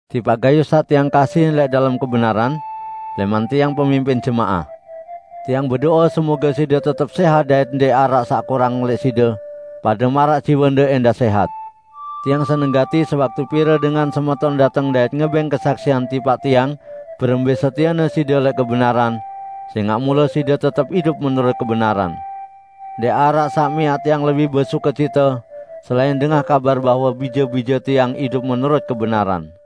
Tipaq Gayus saq tiang kasihin lẽq dalem kebenaran, lẽman tiang pemimpin jemaah. Tiang bedo'e semoge side tetep sẽhat dait ndẽq araq saq kurang lẽq side, pade maraq jiwende ẽndah sẽhat. Tiang seneng gati sewaktu pire dengan semeton dateng dait ngebẽng kesaksian tipaq tiang berembẽ setiene side lẽq kebenaran, sẽngaq mule side tetep idup menurut kebenaran. Ndẽq araq saq miaq tiang lebih besukecite, selain dengah kabar bahwe bije-bije tiang idup menurut kebenaran.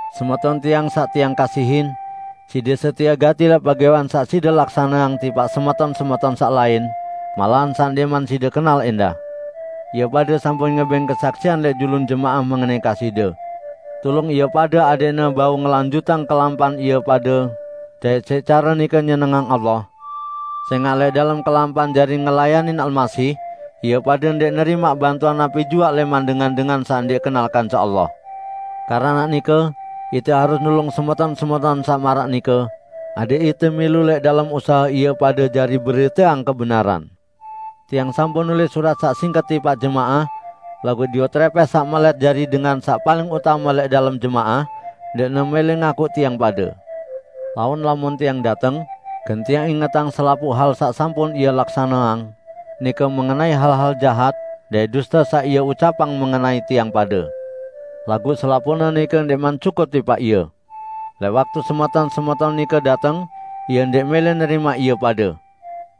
Semeton tiang saq tiang kasihin, side setie gati lẽq pegawẽan saq side laksaneang tipaq semeton-semeton saq lain; malahan saq ndẽqman side kenal ẽndah. Ie pade sampun ngebẽng kesaksian lẽq julun jemaah mengenai kasihde. Tulung ie pade adẽqne bau ngelanjutang kelampan ie pade dait siq care nike nyenengang Allah, sẽngaq lẽq dalem kelampan jari ngelayanin Almasih, ie pade ndẽq nerimaq bantuan napi juaq lẽman dengan-dengan saq ndẽq kenal kance Allah. Keranaq nike ite harus nulung semeton-semeton saq maraq nike, adẽq ite milu lẽq dalem usahe ie pade jari beriteang kebenaran. Tiang sampun nulis surat saq singket tipaq jemaah, laguq Diotrepes saq melẽt jari dengan saq paling utame lẽq dalem jemaah, ndẽqne mẽlẽ ngakuq tiang pade. Laun lamun tiang dateng, gen tiang ingetang selapuq hal saq sampun ie laksaneang, nike mengenai hal-hal jahat dait duste saq ie ucapang mengenai tiang pade! Laguq selapuqne nike ndẽqman cukup tipaq ie. Lẽq waktu semeton-semeton nike dateng, ie ndẽq mẽlẽ nerimaq ie pade.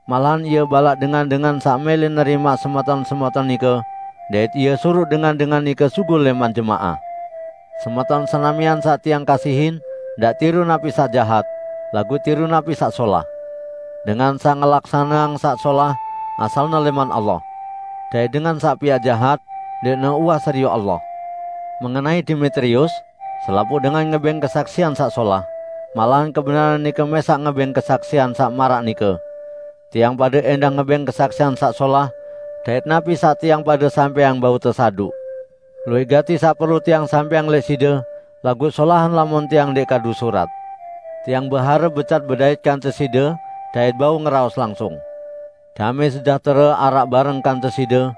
Malahan ie balaq dengan-dengan saq mẽlẽ nerimaq semeton-semeton nike, dait ie suruq dengan-dengan nike sugul lẽman jemaah! Semeton senamian saq tiang kasihin, ndaq tiru napi saq jahat, laguq tiru napi saq solah. Dengan saq ngelaksaneang saq solah, asalne lẽman Allah. Dait dengan saq piaq jahat, ndẽqne uwah serioq Allah. Mengenai Demetrius, selapuq dengan ngebẽng kesaksian saq solah, malahan kebenaran nike mẽsaq ngebẽng kesaksian saq maraq nike. Tiang pade ẽndah ngebẽng kesaksian saq solah, dait napi saq tiang pade sampẽang bau tesaduq. Luwẽq gati saq perlu tiang sampẽang lẽq side, laguq solahan lamun tiang ndẽq kadu surat. Tiang beharep becat bedait kance side dait bau ngeraos langsung. Damẽ sejahtere araq bareng kance side!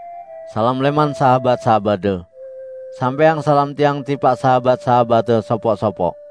Salam lẽman sahabat-sahabatde. Sampẽang salam tiang tipaq sahabat-sahabatte sopoq-sopoq.